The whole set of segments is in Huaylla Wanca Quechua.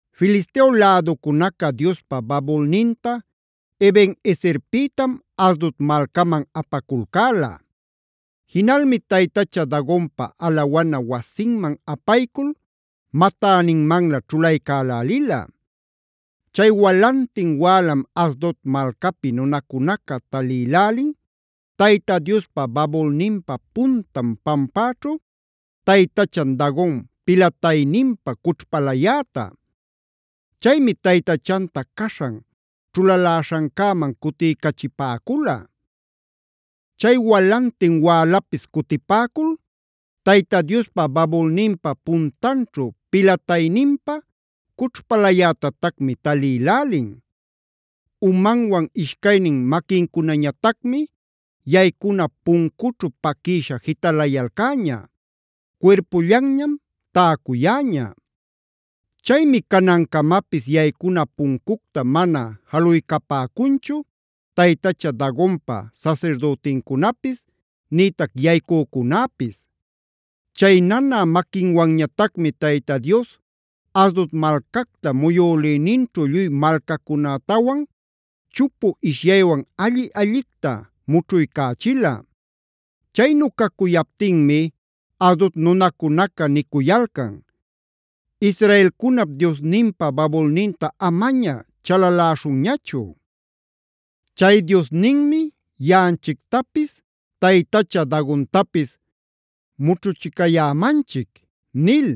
Filisteo läducunaca Diospa babulninta Eben-ezerpïtam Asdod malcaman apaculcäla. Jinalmi taytacha Dagonpa alawana wasinman apaycul matäninmanlä ćhulaycälälila. Chay walantin wälam Asdod malcapi nunacunaca talïlälin Tayta Diospa babulninpa puntan pampäćhu taytachan Dagon pilatayninpa cućhpalayäta. Chaymi taytachanta caśhan ćhulaläśhancäman cutiycachipäcula. Chay walantin wälapis cutipäcul Tayta Diospa babulninpa puntanćhu pilatayninpa cućhpalayätatacmi talïlälin. Umanwan ishcaynin maquincunañatacmi yaycuna puncućhu paquïsha jitalayalcäña; cuirpullanñam täcuyäña. Chaymi canancamapis yaycuna puncucta mana jaluycapäcunchu taytacha Dagonpa sasirdütincunapis nïtac yaycücunäpis. Chay nanä maquinwanñatacmi Tayta Dios Asdod malcacta muyülïninćhu lluy malcacunätawan chupu ishyaywan alli-allicta mućhuycächila. Chaynu cacuyaptinmi Asdod nunacunaca nicuyalcan: “Israelcunap Diosninpa babulninta amaña chalaläśhunñachu. Chay Diosninmi yaꞌanchictapis taytacha Dagontapis mućhuchicayämanchic” nil.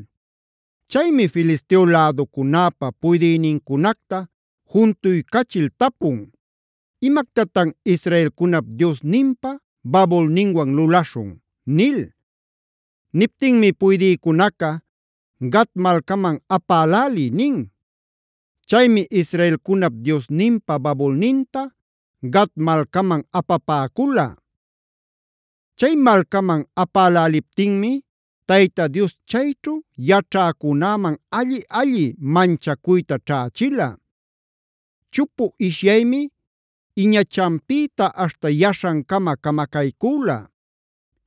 Chaymi Filisteo läducunäpa puydïnincunacta juntuycachil tapun: “¿Imactatan israelcunap Diosninpa babulninwan lulaśhun?” nil. Niptinmi puydïcunaca: “Gat malcaman apäläliy” nin. Chaymi israelcunap Diosninpa babulninta Gat malcaman apapäcula. Chay malcaman apäläliptinmi Tayta Dios chayćhu yaćhäcunäman alli-alli manchacuyta ćhächila. Chupu ishyaymi iñachanpïta aśhta yaśhancama camacaycüla.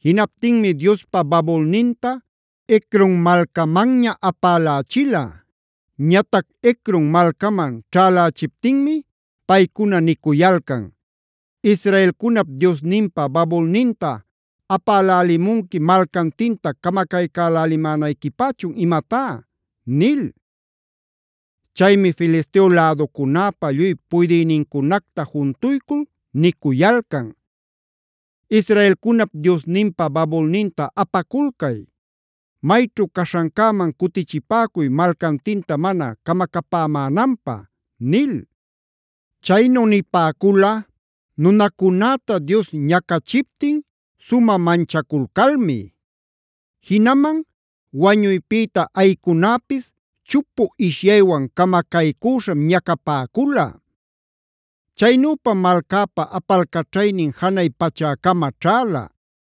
Jinaptinmi Diospa babulninta Ecron malcamanña apälächila. Ñatac Ecron malcaman ćhälächiptinmi paycuna nicuyalcan: “Israelcunap Diosninpa babulninta apälälimunqui malcantinta camacaycälälimänayquipächun imatá” nil. Chaymi Filisteo läducunäpa lluy puydïnincunacta juntuycul nicuyalcan: “Israelcunap Diosninpa babulninta apaculcay. Mayćhu caśhancäman cutichipäcuy malcantinta mana camacapämänanpä” nil. Chaynu nipäcula nunacunäta Dios ñacachiptin sumä manchaculcalmi. Jinaman wañuypïta ayïcunäpis chupu ishyaywan camacaycüśham ñacapäcula. Chaynüpam malcäpa apalcaćhaynin janay pachäcama ćhäla.